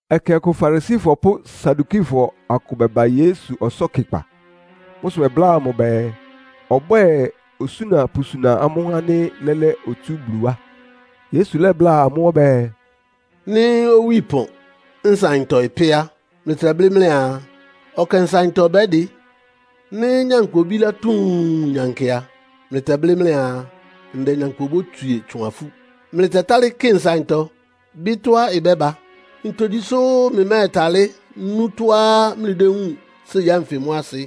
Ɛkɛ ɔkʋ Farisifɔ pʋ́ Sadukifɔ akʋ bɛba Yesu ɔsɔ́kɩkpa. Mʋ́ sʋ bɛbláa mʋ bɛɛ, ɔbwɛ́ɛ osúna pʋsuna amʋ́ ánɩ́ lɛ́lɛ́ otsú Bulu wá. Yesu lɛ́bláa amʋ́ ɔbɛ́ɛ, “Nɩ́ owí ɩpɔn, nsaɩntɔ ɩpɛ́ á, mlɩtɛblɩ́ mlɩaa, ‘Ɔkɛ nsaɩntɔ bɛ́dɩ.’ Nɩ́ nyankpʋ obílá tuun nyankɩ a, mlɩtɛblɩ́ mlɩaa, ‘Ndɛ nyankpʋ obótswie tsʋn afú.’ Mlɩtɛtálɩ́ kɩ nsaɩntɔ, bɩ́ tɔ́á ɩbɛ́ba. Ntogyi sʋ́ mlɩmɛ́tálɩ́ nú tɔ́á mlɩdéwúun séi ánfɩ mʋ́ asɩ.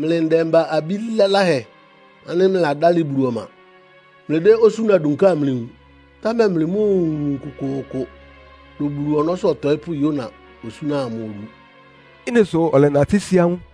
Mlɩ ndɛmba-abí laláhɛ ánɩ́ mlɩladálɩ Bulu ɔma, mlɩdɛ́ osúna dunká amlɩwun, támɛ mlɩmóowun kʋkʋʋkʋ dʋn Bulu ɔnɔ́sʋ́ ɔtɔɩ́pʋ́ Yona osúna amʋ odu.” Ɩ́nɩ sʋ ɔlɛnatɩ́ sí amʋ́.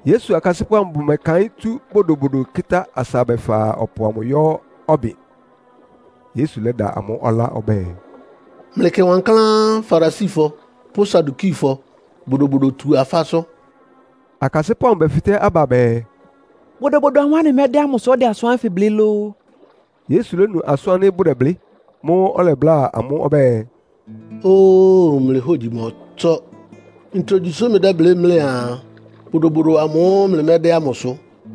Yesu akasɩ́pʋ́ amʋ bʋmɛkaɩ́n tsú bodobodo kɩ́tá asa bɛfa ɔpʋ amʋ yɔ́ ɔbɩn. Yesu lɛ́da amʋ́ ɔlá ɔbɛ́ɛ, “Mlɩkɩ wankláán Farisifɔ pʋ́ Sadukifɔ Bodobodotu-afásʋ́.” Akasɩ́pʋ́ amʋ bɛfɩtɛ́ aba bɛɛ, “Bodobodo amʋ́ʋ́ anɩmɛ́dɛ́ ámʋ sʋ́ ɔdɛ asʋ́n ánfɩ blɩ́ lóó?” Yesu lónu asʋ́n ánɩ́ bʋdɛblɩ́. Mʋ́ʋ́ ɔlɛbláa amʋ́ ɔbɛ́ɛ, “Óo, mlɩ hógyi mɔ́tsɔ́. Ntogyi sʋ́ mlɩdɛ́blɩ́ mlɩaa bodobodo ámʋ́ʋ́ mlɩmɛ́dɛ́ ámʋ sʋ?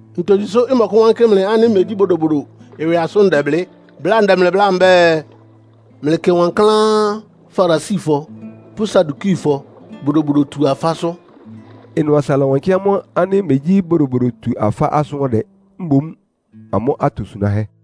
Ntogyi sʋ́ ɩmɔkʋ́wánkɩ́ mlɩ ánɩ́ megyí bodobodo ɩwɩ asʋ́n ndɛblɩ́? Bláa ndɛ mlɩ bláa mbɛ́ɛ, “Mlɩkɩ wankláán Farisifɔ pʋ́ Sadukifɔ Bodobodotu-afásʋ́.” Ɩnʋ asa ɩlɔwankɩ́ amʋ́ ánɩ́ megyí Bodobodotu-afásʋ́ ɔdɛ, mboún amʋ́ atosunáhɛ́.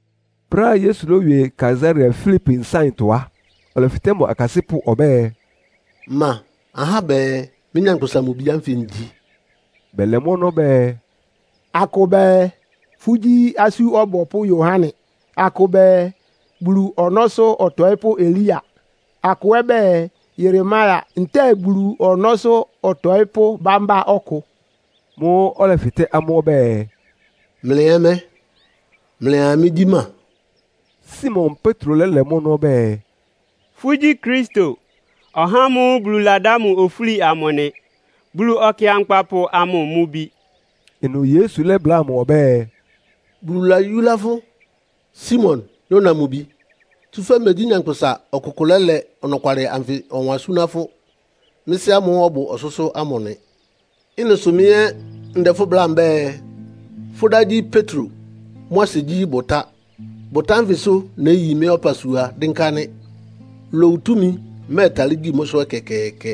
Brɛ́á Yesu lówie Kaesarea Filipi nsáɩntɔ á, ɔlɛfɩtɛ́ mʋ akasɩ́pʋ́ ɔbɛ́ɛ, “Ma ahá bɛɛ mɩ́, Nyankpʋsa-Mʋ-Bi ánfɩ ngyi?” Bɛlɛ mʋ́ ɔnɔ́ bɛɛ, “Akʋ bɛɛ, fʋ́gyí Asú Ɔbɔpʋ́ Yohane. Akʋ bɛɛ, Bulu Ɔnɔ́sʋ́ Ɔtɔɩ́pʋ́ Elia. Akʋ ɛ́ bɛɛ, Yeremia ntɛ́ɛ Bulu ɔnɔ́sʋ́ ɔtɔɩ́pʋ́ bambá ɔkʋ.” Mʋ́ʋ́ ɔlɛfɩtɛ́ amʋ́ ɔbɛ́ɛ, “Mlɩ ɛ́ mɛ́? Mlɩa mɩ́gyí ma?” Simon Petro lɛ́lɛ mʋ́ ɔnɔ́ ɔbɛ́ɛ, “Fʋ́gyí Kristo, (ɔhá ámʋ́ʋ́ Bulu ladá mʋ ofúli amʋ) nɩ. Bulu Ɔkɩankpapʋ amʋ mʋ Bi.” Ɩnʋ Yesu lɛ́bláa mʋ ɔbɛ́ɛ, “Bulu layúlá fʋ́ Simon, Yona mʋ bi, tsúfɛ́ megyí nyankpʋsa ɔkʋkʋ lɛ́lɛ ɔnɔkwalɩ anfɩ ɔwan súná fʋ́. Mɩ́ Sɩ́ ámʋ́ʋ́ ɔbʋ ɔsʋ́sʋ́ ámʋ nɩ. Ɩ́nɩ sʋ mɩ́ ɛ́ ndɛ fʋ́ bláa mbɛ́ɛ, fʋ́ dá gyí Petro. Mʋ́ asɩ gyí, ‘Bʋtá.’ Bʋtá ánfɩsʋ néyi mɩ́ ɔpasua dɩ́nká nɩ́. Lowu túmi mɛ́ɛtalɩ́ gyí mʋ́sʋ́ ɛkɛkɛɛkɛ.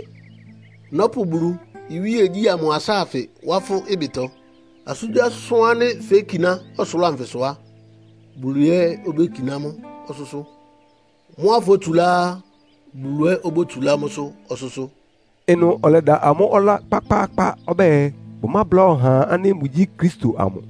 Nɔ́pʋ Bulu iwíegyí ámʋ asáafɩ wá fʋ́ ɩbɩtɔ. Asʋ́ngyíasʋ́n ánɩ́ fékiná ɔsʋlʋ́ʋ anfɩsʋ á, Bulu ɛ́ obékiná mʋ́ ɔsʋ́sʋ́. Mʋ́á fótsulá á, Bulu ɛ́ obótsulá mʋ́sʋ́ ɔsʋ́sʋ́.” Ɩnʋ ɔlɛda amʋ́ ɔlá kpákpáákpá ɔbɛ́ɛ, bʋmábláa ɔhaa ánɩ́ mʋgyí Kristo amʋ.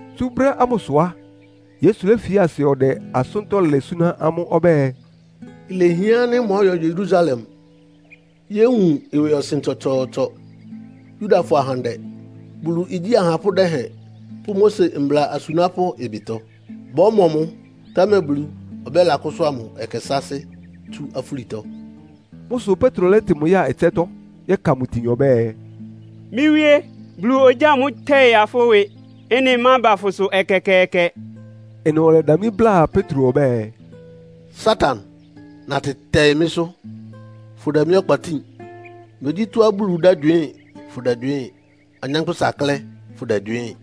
Tsú brɛ́ ámʋsʋ á, Yesu léfi asɩ ɔdɛ asʋ́ntɔ́ lɛ súná amʋ́ ɔbɛ́ɛ, “Ilehián ánɩ́ mɔ́yɔ Yerusalem yówun ɩwɩɔsɩn tsɔtsɔɔtsɔ Yudafɔ ahandɛ, Bulu igyí ahapʋ́ dɛhɛn pʋ́ Mose mbla asunápʋ́ ɩbɩtɔ. Bɔ́mɔ mʋ, támɛ Bulu ɔbɛ́lakʋ́sʋ́a mʋ ɛkɛ sáásɩ́ tsú afúlitɔ.” Mʋ́ sʋ Petro lɛ́tɩ mʋ ya ɩtsɛ́tɔ́, yɛ́ka mʋ itin ɔbɛ́ɛ, “Mɩ́ Wíé, Bulu ogyáa mʋ́ tɛ́ɩ́ ya fʋ́ ɩwɩ. Ɩ́nɩ mába fʋsʋ ɛkɛkɛɛkɛ.” Ɩnʋ ɔlɛdamlí bláa Petro ɔbɛ́ɛ, “Satan, natɩ tɛɩ mɩ́sʋ́! Fʋdɛ mɩ́ ɔkpa tíin. Megyí tɔ́á Bulu dɛ́gywɩɩ́n fʋdɛgywɩɩ́n, anyánkpʋ́sa klɛ́ fʋdɛgywɩɩ́n.”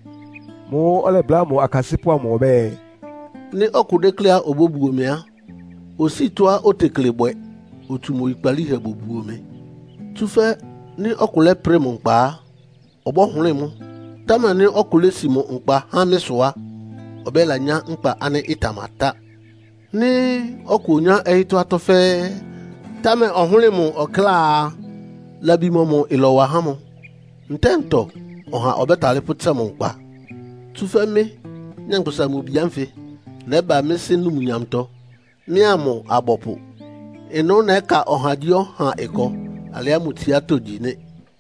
Mʋ́ʋ́ ɔlɛbláa mʋ akasɩ́pʋ́ amʋ ɔbɛ́ɛ, “Nɩ́ ɔkʋ dékléá obóbuo mɩ á, osíi tɔ́á otekle bwɛ, otsu mʋ oyikpalíhɛ bobuo mɩ. Tsúfɛ́ nɩ́ ɔkʋ lɛ́prɩ mʋ nkpa á, ɩbɔ́hʋlɩ́ɩ mʋ. Támɛ nɩ́ ɔkʋ lési mʋ nkpa há mɩ́ sʋ á, ɔbɛ́lanyá nkpa ánɩ́ ɩtamatá. Nɩ́ ɔkʋ onyá ɔyɩ́tɔ́ atɔ́ fɛ́ɛ́, támɛ ɔhʋ́lɩ mʋ ɔkláa a, labi mɔmʋ ɩlɔwa há mʋ? Ntɛ́ɛ ntɔ ɔha ɔbɛ́talɩ́ pʋ́tsɛ mʋ nkpa? Tsúfɛ́ mɩ́, Nyankpʋsa-Mʋ-Bi ánfɩ nɛ́ba mɩ́ Sɩ́ numnyamtɔ, mɩ́a mʋ abɔpʋ. Ɩnʋ́ nɛ́ka ɔhagyíɔha ɩkɔ alɩá mʋ tsiátɔ́ gyi nɩ́.